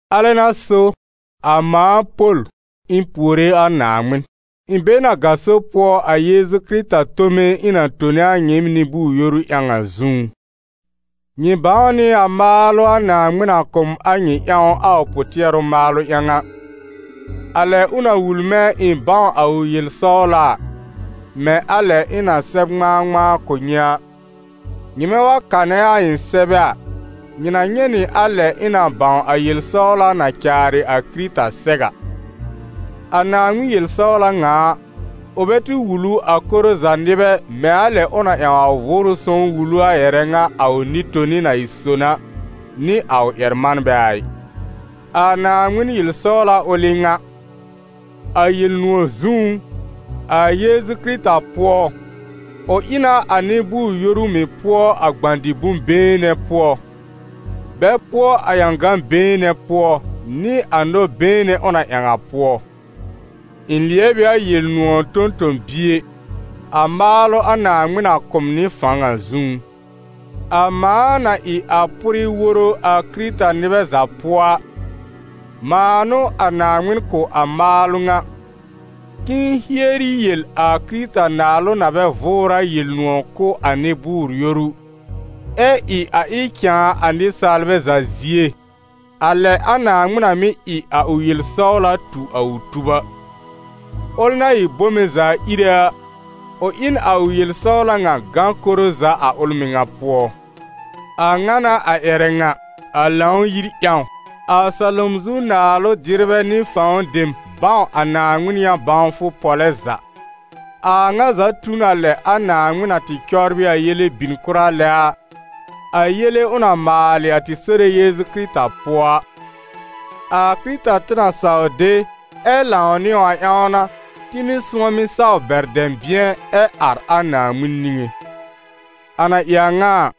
Alɛ n'a so a mãa, Pol, ɩ̃ puore a Naaŋmɩn. Ɩ̃ be n a gaso pʋɔ a Yeezu Kɩrɩta tome ɩ̃ na tone a nyɩɩm nɩ-bʋʋr-yoru ƴãw a zũú. Nyɩ bãw nɩ a maalʋ a Naaŋmɩn na kʋ̀ m a nyɩ ƴãw a ʋ pʋ-tɩɛrʋ maalʋ ƴãw a, a lɛ ʋ na wul mɛ̃ ɩ̃ bãw a ʋ yel-sɔwla a, mɛ̃ a lɛ ɩ̃ na sɛb ŋmãa-ŋmãa kʋ̀ nyɩ a. Nyɩmɛ wa kanɛ a ɩ̃ sɛbɛ a, nyɩ na nyɛ̃ nɩ a lɛ ɩ̃ na bãw a yel-sɔwla na caarɩ a Kɩrɩta sɛw a. A Naaŋmɩn yel-sɔwla ŋa a, ʋ bɛ tɩ wul ʋ a koro za nɩbɛ mɛ̃ a lɛ ʋ na ƴãw a Vʋʋrʋ Sõw wul ʋ a ƴɛrɛ ŋa a ʋ nɩ-toni na ɩ son a, nɩ a ʋ ƴɛr-manbɛ a ɩ. A Naaŋmɩn yel-sɔwla ʋl n'ɩ ŋa: a Yel-nʋ̃ɔ̀ zũú, a Yeezu Kɩrɩta pʋɔ, ʋ ɩ na a nɩ-bʋʋr-yoru mɩ̀ pʋɔ a gbã-dɩ-bʋ̃-been nɛ pʋɔ, bɛ pʋɔ a ƴãgã-been nɛ pʋɔ, nɩ a nɔ-been nɛ ʋ na ƴãw a pʋɔ. Ɩ̃ lɩɛb ɩ a Yel-nʋ̃ɔ̀ tõ-tõ-bie, a maalʋ a Naaŋmɩn na kʋ̀ m nɩ fãw a zũú. A mãa na ɩ a pʋrɩ woro a Kɩrɩta-nɩbɛ za pʋɔ a, mãa n'ʋ a Naaŋmɩn kʋ̀ a maalʋ ŋa, k'ɩ̃ɩ hieri yel a Kɩrɩta Naalʋ na bɛ vʋʋr a Yel-nʋ̃ɔ̀ kʋ̀ a nɩ-bʋʋr-yoru, ɛ ɩ a ɩ cãa a nɩsaalbɛ za zie, a lɛ a Naaŋmɩn na mɩ́ ɩ a ʋ yel-sɔwla tu a ʋ tub a; ʋl na ɩ bome za íre a, ʋ ɩ n a ʋ yel-sɔwla ŋa gã koro za a ʋl mɩŋa pʋɔ. A ŋa n'a a ƴɛrɛ ŋa, a Lãw-yir ƴãw, a salom zu naalʋ-dɩrbɛ nɩ fãw dem bãw a Naaŋmɩn yã-bãwfʋ pɔlɛ za. A a ŋa za tu n a lɛ a Naaŋmɩn na tɩ cɔbrɩ a yele bìn kʋra lɛ a, a yele ʋ na maalɩ a tɩ Sore Yeezu Kɩrɩta pʋɔ a. A Kɩrɩta tɩ na saw de ɛ lãw nɩ a ƴãw n'a, tɩ mɩ́ sʋ̃ɔmɩ saw bɛr dɛ̃bɩ̃ɛ ɛ ar a Naaŋmɩn niŋé. A na ɩ a ŋa a,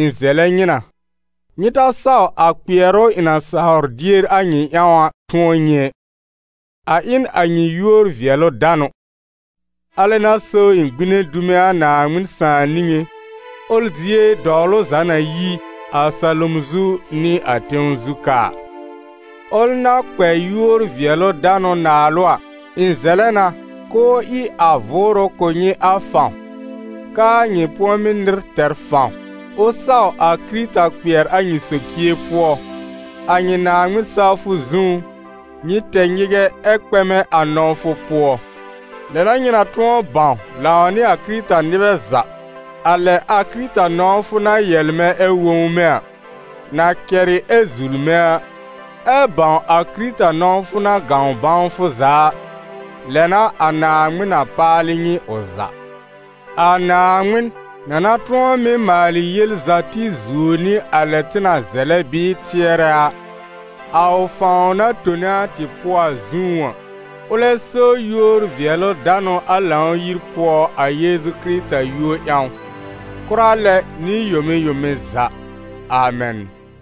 ɩ̃ zɛlɛ nyɩ na, nyɩ ta saw a kpɩɛrʋ ɩ̃ na sawr dier a nyɩ ƴãw a tʋ̃ɔ nyɩ ɛ, a ɩ n a nyɩ yúor-vɩɛlʋ-danʋ. Alɛ n'a so ɩ̃ gbine dume a Naaŋmɩn Sãà niŋé, ʋl zie dɔwlʋ za na yi, a salom zu nɩ a tẽw zu ka a. Ʋl na kpɛ yúor-vɩɛlʋ-danʋ naalʋ a, ɩ̃ zɛlɛ na k'ʋʋ ɩ a Vʋʋrʋ kʋ̀ nyɩ a fãw, k'aa nyɩ pʋ̃ɔmɩ́ nɩr tɛr fãw. Ʋ saw a Kɩrɩta kpɩɛr a nyɩ socie pʋɔ, a nyɩ Naaŋmɩn-sawfʋ zũú, nyɩ tɛ nyɩgɛ ɛ kpɛmɛ a nɔ̃wfʋ pʋɔ. Lɛ n'a nyɩ na tʋ̃ɔ bãw, lãw nɩ a Kɩrɩta-nɩbɛ za, a lɛ a Kɩrɩta nɔ̃wfʋ na yɛlmɛ̃ ɛ wõwme a, na kɛrɩ ɛ zulme a, ɛ́ bãw a Kɩrɩta nɔ̃wfʋ na gãw bãwfʋ za a, lɛ n'a a Naaŋmɩn na paalɩ nyɩ ʋ za. A Naaŋmɩn, na na tʋ̃ɔ mɩ́ maalɩ yel za tɩ zuo nɩ a lɛ tɩ na zɛlɛ bɩɩ tɩɛrɛ a, a ʋ fãw na tone a tɩ pʋɔ a zũú a, ʋlɛ so yúor-vɩɛlʋ-danʋ a Lãw-yir pʋɔ a Yeezu Kɩrɩta yúor ƴãw, kʋra lɛ nɩ yome yome za. Amɛn.